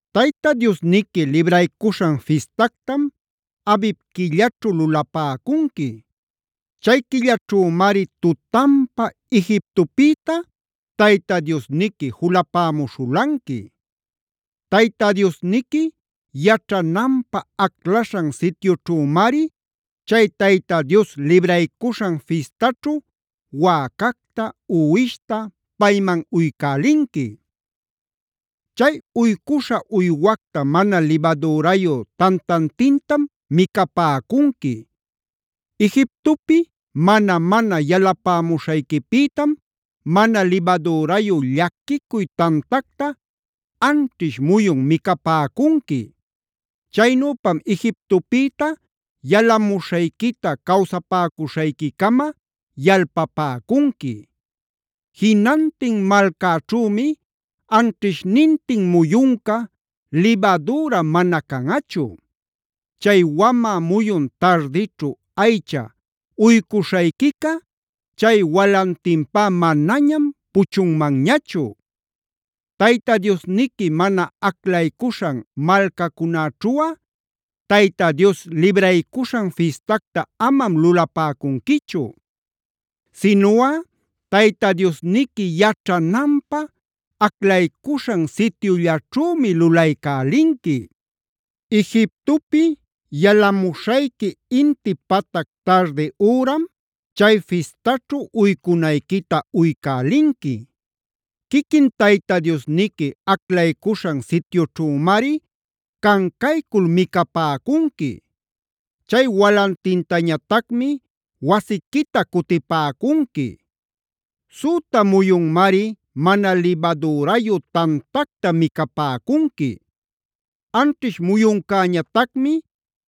Tayta Diosniqui Libraycuśhan Fistactama Abib quillaćhu lulapäcunqui. Chay quillaćhümari tutanpa Egiptopïta Tayta Diosniqui julapämuśhulanqui. Tayta Diosniqui yaćhananpä aclaśhan sityućhümari chay Tayta Dios Libraycuśhan Fistaćhu wäcacta, uwishta payman uycälinqui. “Chay uycuśha uywacta mana libadürayu tantantintam micapäcunqui. Egiptopi mana-mana yalapämuśhayquipïtam mana libadürayu llaquicuy tantacta anćhish muyun micapäcunqui. Chaynüpam Egiptopïta yalamuśhayquita cawsapäcuśhayquicama yalpapäcunqui. Jinantin malcäćhümi anćhishnintin muyunca libadüra mana canꞌachu. Chay wamä muyun tardićhu aycha uycuśhayquica chay walantinpá manañam puchunmanñachu. Tayta Diosniqui mana aclaycuśhan malcacunäćhuꞌa Tayta Dios Libraycuśhan Fistacta amam lulapäcunquichu. Sinuꞌa Tayta Diosniqui yaćhananpä aclaycuśhan sityullaćhümi lulaycälinqui. Egiptopi yalamuśhayqui inti patac tardi üram chay fistaćhu uycunayquita uycälinqui. Quiquin Tayta Diosniqui aclaycuśhan sityućhümari cancaycul micapäcunqui. Chay walantintañatacmi wasiquita cutïpäcunqui. Süta muyunmari mana libadürayu tantacta micapäcunqui. Anćhish muyuncäñatacmi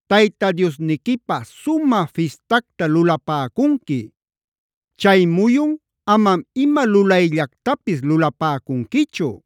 Tayta Diosniquipä sumä fistacta lulapäcunqui; chay muyun amam ima lulayllactapis lulapäcunquichu.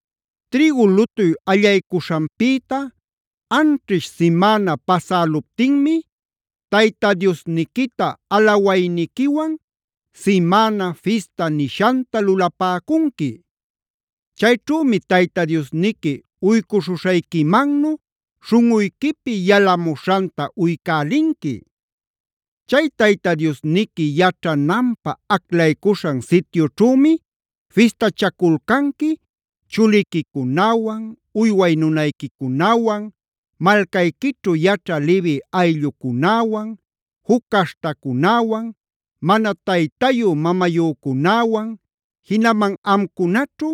“Trïgu lutuy allaycuśhanpïta anćhish simäna pasäluptinmi, Tayta Diosniquita alawayniquiwan Simäna Fistab nishanta lulapäcunqui. Chayćhümi Tayta Diosniqui uycuśhuśhayquimannu śhunꞌuyquipi yalamuśhanta uycälinqui. Chay Tayta Diosniqui yaćhananpä aclaycuśhan sityućhümi fistachaculcanqui chuliquicunawan, uyway nunayquicunawan, malcayquićhu yaćhä Levi ayllucunäwan, juc caśhtacunäwan, mana taytayü-mamayücunäwan, jinaman amcunaćhu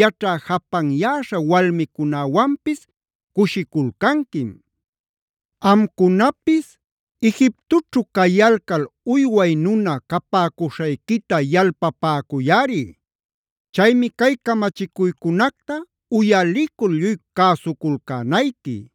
yaćhä japanyäśha walmicunäwanpis cushiculcanquim. Amcunapis Egiptoćhu cayalcal uyway nuna capäcuśhayquita yalpapäcuyꞌari. Chaymi cay camachicuycunacta uyalicul lluy cäsuculcänayqui.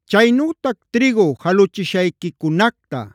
“Chaynütac trïgu jaluchishayquicunacta,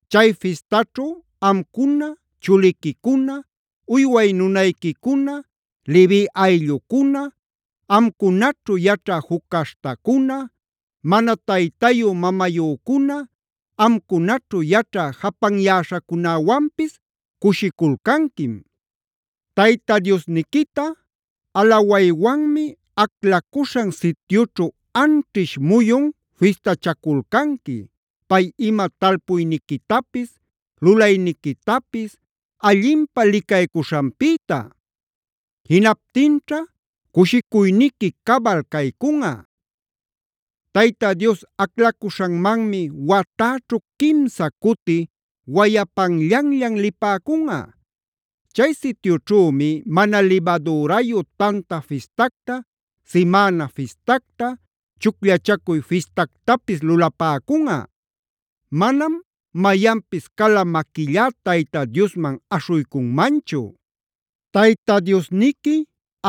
Chay fistaćhu amcuna, chuliquicuna, uyway nunayquicuna, Levi ayllucuna, amcunaćhu yaćhä juc caśhtacuna, mana taytayü-mamayücuna, amcunaćhu yaćhä japanyäśhacunäwanpis cushiculcanquim. Tayta Diosniquita alawaywanmi aclacuśhan sityućhu anćhish muyun fistachaculcanqui, pay ima talpuyniquitapis, lulayniquitapis allinpä licaycuśhanpïta. Jinaptinćha cushicuyniqui cabal caycunꞌa. Tayta Dios aclacuśhanmanmi watäćhu quimsa cuti wayapanllanllan lipäcunꞌa. Chay sityućhümi Mana Libadürayu Tanta Fistacta, Simäna Fistacta, Chucllachacuy Fistactapis lulapäcunꞌa. Manam mayanpis cala maquillá Tayta Diosman aśhuycunmanchu. Tayta Diosniqui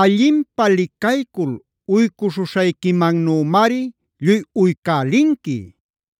allinpä licaycul uycuśhuśhayquimannümari lluy uycälinqui.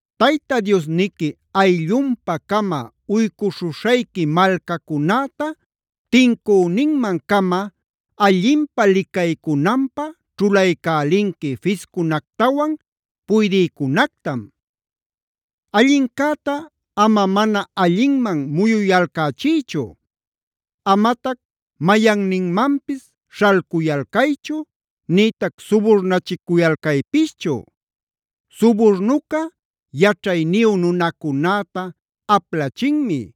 Tayta Diosniqui ayllunpa-cama uycuśhuśhayqui malcacunäta tincüninman-cama allinpä licaycunanpä ćhulaycälinqui fiscunactawan puydïcunactam. Allincäta ama mana allinman muyuyalcächïchu; amatac mayanninmanpis śhalcuyalcaychu, nïtac suburnachicuyalcaypischu. Suburnuca yaćhayniyu nunacunäta aplachinmi;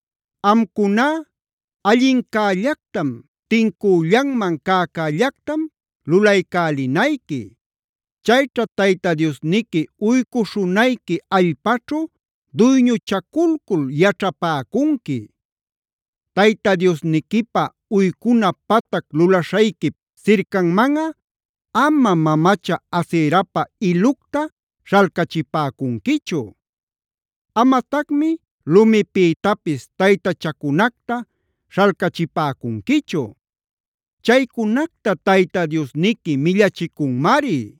Amcuná allincällactam, tincüllanman cäcällactam lulaycälinayqui. Chayćha Tayta Diosniqui uycuśhunayqui allpaćhu duyñuchaculcul yaćhapäcunqui. Tayta Diosniquipä uycuna patac lulaśhayquip sircanmanꞌa amam mamacha Aserapa ilucta śhalcachipäcunquichu.e Amatacmi lumipïtapis taytachacunacta śhalcachipäcunquichu.f Chaycunacta Tayta Diosniqui millachicunmari.